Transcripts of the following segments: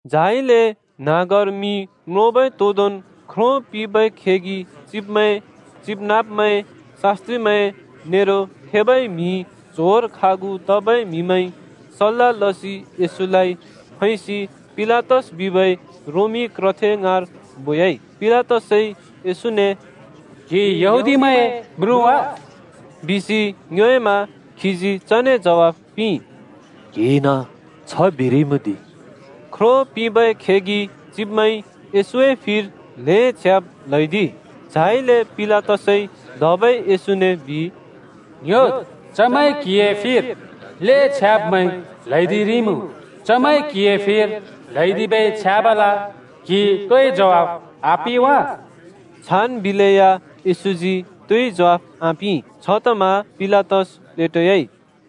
झाइले न्‍हाँगर मि म्रोंबै तोदोंन् ख्रो पिंबै खेगि चिब्मैं, चिबनाँब्मैं, शास्‍त्रिमैं नेरो थेबै म्हि च्होंर खागु तबै म्हिमैंइ सल्‍ला लसि येशूलाइ फैसि पिलातस बिबै रोमी क्रथे ङाँर बोयाइ। पिलातसइ येशूने “क्‍हि यहूदीमैंए म्रुँ वा?” बिसि ङ्योएमा खीजी चने ज्वाइ पिंइ, “क्‍हिइन छ बिरिइमुँ दि।” ख्रो पिंबै खेगि चिब्मैंइ येशूए फिर ल्‍हें छ्याब् ल्हैदिइ। झाइले पिलातसइ धबै येशूने बिइ, “ङ्‌ह्‍योद्! चमैंइ क्‍हिए फिर ल्‍हें छ्याब्मैं ल्हैदिरिइमुँ। चमैंइ क्हिए फिर ल्हैदिबै छ्याबल क्‍हिइ तोइ ज्वाफ आपिं वा?” छान् बिलेया येशूजी तोइ ज्वाफ आपिं। छतमा पिलातस प्लेटोयाइ।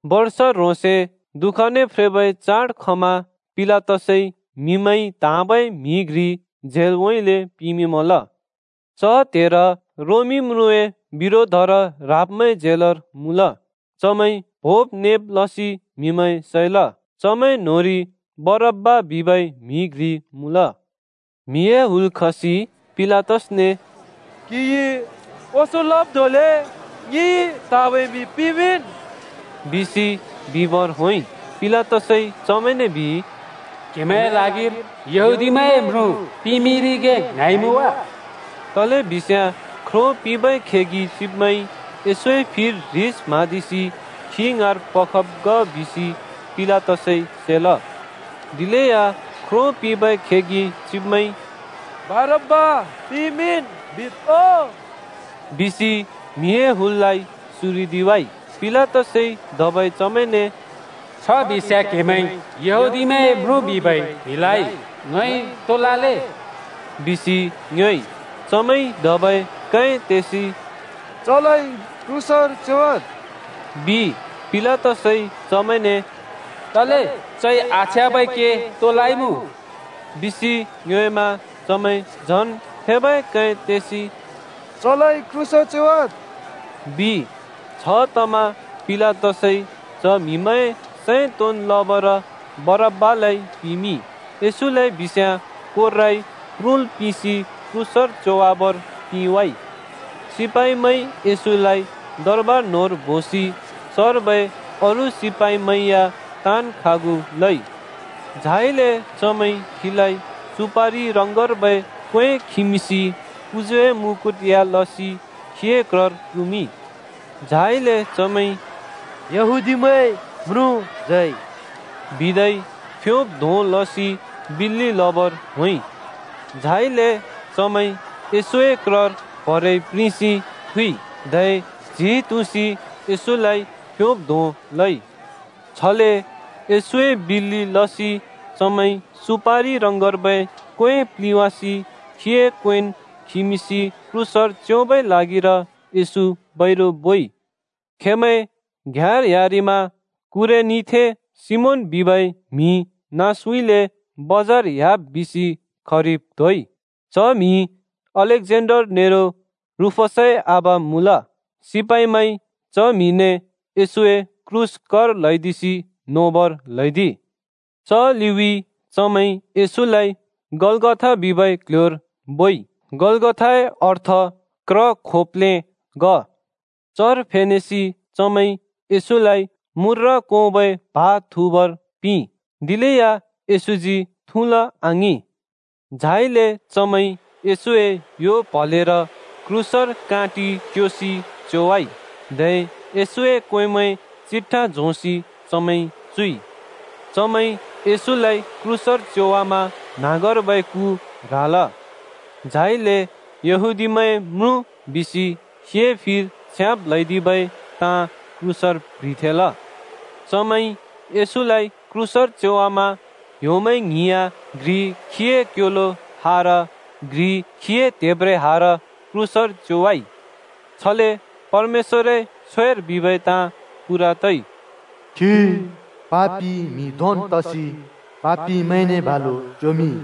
बर्ष ह्रोंसे दुःखने फ्रेबै चाड खमा पिलातसइ म्हिमैंइ त्हाँबै म्हि घ्रि झेलउँइँले पिमिंमल। च त्हेर रोमी म्रुँए बिरोधर राब्मैं झेलर मुँल। चमैंइ प्होंब् नेब् लसि म्‍हिमैं सैल। चमैं न्‍होंरि बरब्‍बा बिबै म्‍हि घ्रि मुँल। म्हिए हुल खसि पिलातसने “क्‍हिइ ओंसों लब् धोंले ङिइ त्हाँबै म्हि पिमिंन्,” बिसि बिबर होंइ। पिलातसइ चमैंने बिइ, “क्‍हेमैंए ल्हागिर यहूदीमैंए म्रुँ पिमिंरिगे ङ्हाँइमुँ वा?” तलेबिस्याँ ख्रो पिंबै खेगि चिब्मैंइ येशूए फिर ह्रिस म्हाँदिसि खी ङाँर पखब् ग बिसि पिलातसइ सेल। दिलेया ख्रो पिंबै खेगि चिब्मैंइ “बरब्‍बा पिमिंन् बिद् ओ!” बिसि म्हिए हुललाइ सुरिदिवाइ। पिलातसइ धबै चमैंने “छ बिस्‍याँ क्‍हेमैंइ यहूदीमैंए म्रुँ बिबै म्हिलाइ ङइ तो लले दि?” बिसि ङ्योएइ। चमैंइ धबै कै तेसि “चलाइ क्रूसर च्योवाद्,” बिइ। पिलातसइ चमैंने “तले? चइ आछ्याँबै के तो लइमुँ?” बिसि ङ्योएमा चमैं झन थेबै कै तेसि “चलाइ क्रूसर च्योवाद्,” बिइ। छतमा पिलातसइ च म्हिमैंए सैं तोंन् लबर बरब्‍बालाइ पिमिंइ, येशूलाइ बिस्याँ कोर्राइ प्रुल् पिंसि क्रूसर च्योवाबर पिंवाइ। सिपाइमैंइ येशूलाइ दरबार न्‍होंर बोसि चर्बै अरू सिपाइमैं या ताँन् खागु लइ। झाइले चमैंइ खीलाइ सुपारि रङर्बै क्‍वें खिमिंसि पुजुए मुकुट या लसि खीए क्रर कुमिंइ। झाइले चमैंइ “यहूदीमैंए म्रुँ जय!” बिदै फ्योब् धों लसि बिल्‍लि लबर होंइ। झाइले चमैंइ येशूए क्रर प्‍हरेइ प्रिंसि थुइ, धै च्‍हि तुँसि येशूलाइ फ्‍योब् धों लइ। छले येशूए बिल्‍लि लसि चमैंइ सुपारि रङर्बै क्‍वें प्‍लिवासि खीए क्‍वेंन् खिमिंसि क्रूसर च्योबै ल्हागिर येशू बैरु बोइ। खेंमैं घ्याँर ह्‍यारिमा कुरेनीथें सिमोन बिबै म्‍हि नाँसउँले बजार ह्‍याब् बिसि खरिब् त्होइ। च म्हि अलेक्जेन्डर नेरो रूफसए आबा मुँल। सिपाइमैंइ च म्हिने येशूए क्रूस कर ल्हैदिसि नोबर ल्‍हैदिइ। च लिउँइँ चमैंइ येशूलाइ गलगथा बिबै क्‍ल्‍ह्‍योर बोइ। गलगथाए अर्थ क्र खोप्‍लें ग। चर फेनेसि चमैंइ येशूलाइ मूर्र कोंबै प्हा थुँबर पिंइ, दिलेया येशूजी थुँल आङिं। झाइले चमैंइ येशूए यो प्हलेर काँटि क्योसि क्रूसर च्योवाइ, धै येशूए क्‍वेंमैं चिट्ठा झोंसि चमैंइ चुइ। चमैंइ येशूलाइ क्रूसर च्योवामा न्‍हाँगर्बै कु ह्राल। झाइले “यहूदीमैंए म्रुँ” बिसि खीए फिर छ्याब् ल्हैदिबै ताँ क्रूसर प्‍ह्रिथेंल। चमैंइ येशूलाइ क्रूसर च्योवामा ह्‍योमैं ङ्हिं या घ्रि खीए क्योलो हार, घ्रि खीए त्हेब्रेहार क्रूसर च्योवाइ। छले परमेश्‍वरए छ्वेर बिबै ताँ पूरा तइ, “खी पापि म्हि धोंन् तसि पापिमैंने बालु च्योमिंइ।”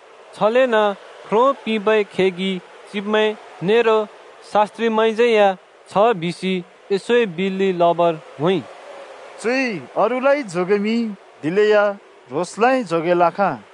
छलेन ख्रो पिंबै खेगि चिब्मैं नेरो शास्‍त्रिमैंज्यै या छ बिसि येशूए बिल्‍लि लबर होंइ, “चुइ अरूलाइ जोगेमिंइ दिलेया ह्रोंसलाइ जोगेल् आखाँ।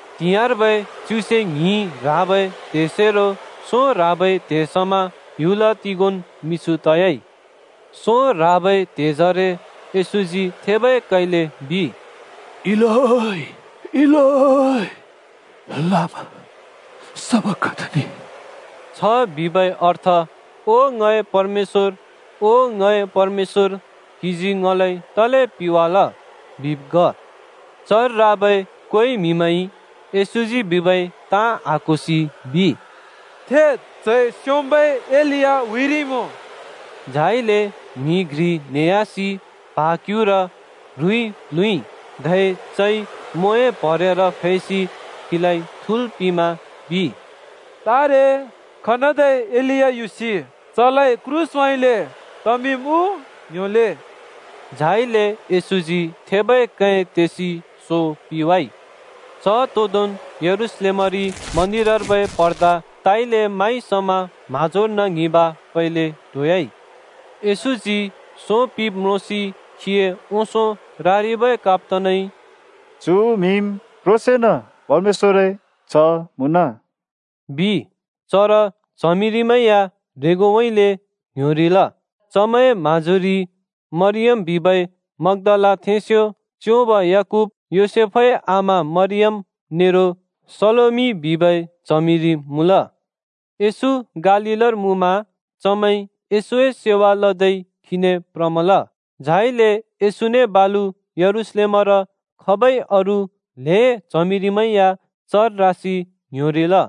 त्‍हिंयाँर्बै च्युसे ङ्हिं ह्राबै त्हेसेरो सों ह्राबै त्हे समा ह्‍युल तिगोंन् मिछु तयाइ। सों ह्राबै त्हेजरे येशूजी थेबै कैले बिइ, “इलोइ, इलोइ, लामा सबखथनि?” (छ बिबै अर्थ “ओ ङए परमेश्‍वर, ओ ङए परमेश्‍वर, क्‍हिजी ङलाइ तले पिवाल?” बिब् ग।) चर राबै कोइ म्‍हिमैंइ येशूजी बिबै ताँ आक्होसि बिइ, “थेत्ति, चइ स्‍योंम्‍बै एलिया हुइरिइमुँ।” झाइले म्‍हि घ्रि न्हेह्‍यासि प्हा क्युँर ह्रुइ प्ल्हुँइ। धै चइ म्वोए प्हरेर फैसि खीलाइ थुँल् पिंमा बिइ, “तारे, एलिया खनदै युसि चलाइ क्रूसउँइँले तमिंम् उ, ङ्‍ह्‍योले!” झाइले येशूजी थेबै कै तेसि सो पिवाइ। च तोंदोंन् यरूशलेमरि मन्दिरर्बै पर्दा ताइले माइ समा म्‍हाँजोर्न ङ्हिबाँ फैले टोह्‍याइ। येशूजी सो पिब् म्रोंसि खीए ओंसों रारिबै कप्‍तानइ “चु म्‍हिम् क्‍ह्रोंसेंन परमेश्‍वरए च्‍ह मुँन,” बिइ। चर च्हमिरिमैं या ह्रेंगोउँइँले ङ्‌ह्‍योरिल। चमैंए म्‍हाँजोरि मरियम बिबै मग्‍दालाथेंस्‍यो, च्‍योंब याकूब, योसेफए आमा मरियम नेरो सलोमि बिबै च्हमिरि मुँल। येशू गालीलर मुँमा चमैंइ येशूए सेवा लदै खीने प्रमल। झाइले येशूने बालु यरूशलेमर खबै अरू ल्‍हें च्हमिरिमैं या चर रासि ङ्‌ह्‍योरिल।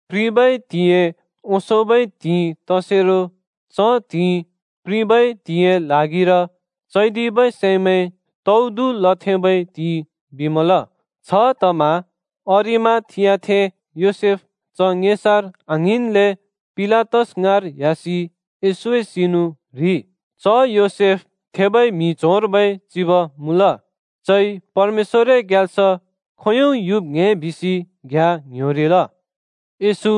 प्रिबै त्हिंइए ओंसोंबै त्हिंइ तसेरो च त्हिंइ “प्रिबै त्हिंइए ल्हागिर चैदिबै सैमैं तौदु लथेंबै त्हिइ” बिमल। छतमा अरिमाथियाथें योसेफ च ङेसार आङ्हिंन्ले पिलातस ङाँर ह्‍यासि येशूए सिनु ह्रिइ। (च योसेफ थेबै म्हि च्होंर्बै चिब मुँल। चइ परमेश्‍वरए ग्याल्स खोंयों युब् ङ्‍हे बिसि घ्‍याँ ङ्‌ह्‍योरिल।) येशू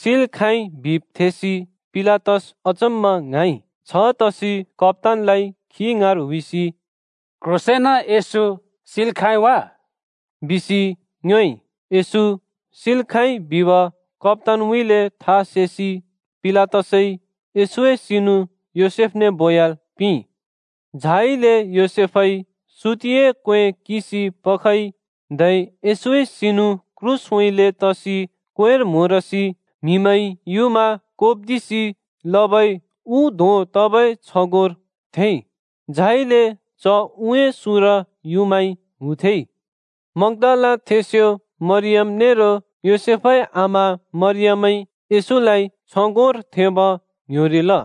सिल् खाँइ बिब् थेसि पिलातस अचम्‍मा ङ्हाँइ। छतसि कप्‍तानलाइ खी ङाँर हुइसि “क्ह्रोंसेंन येशू सिल् खाँइ वा?” बिसि ङ्योएइ। येशू सिल् खाँइ बिब कप्‍तानउँइँले था सेसि पिलातसइ येशूए सिनु योसेफने बोयाल् पिंइ। झाइले योसेफइ सुतिए क्‍वें किंसि पखइ धै येशूए सिनु क्रूसउँइँले तसि क्‍वेंर म्‍होरसि म्‍हिमैंइ युँमा कोप्दिसि लबै उ धों तबै छगोंर थेंइ, झाइले च उए सुँर युँमाइ हुथेंइ। मग्‍दालाथेंस्‍यो मरियम नेरो योसेफए आमा मरियमइ येशूलाइ छगोंर थेंब ङ्‌ह्‍योरिल।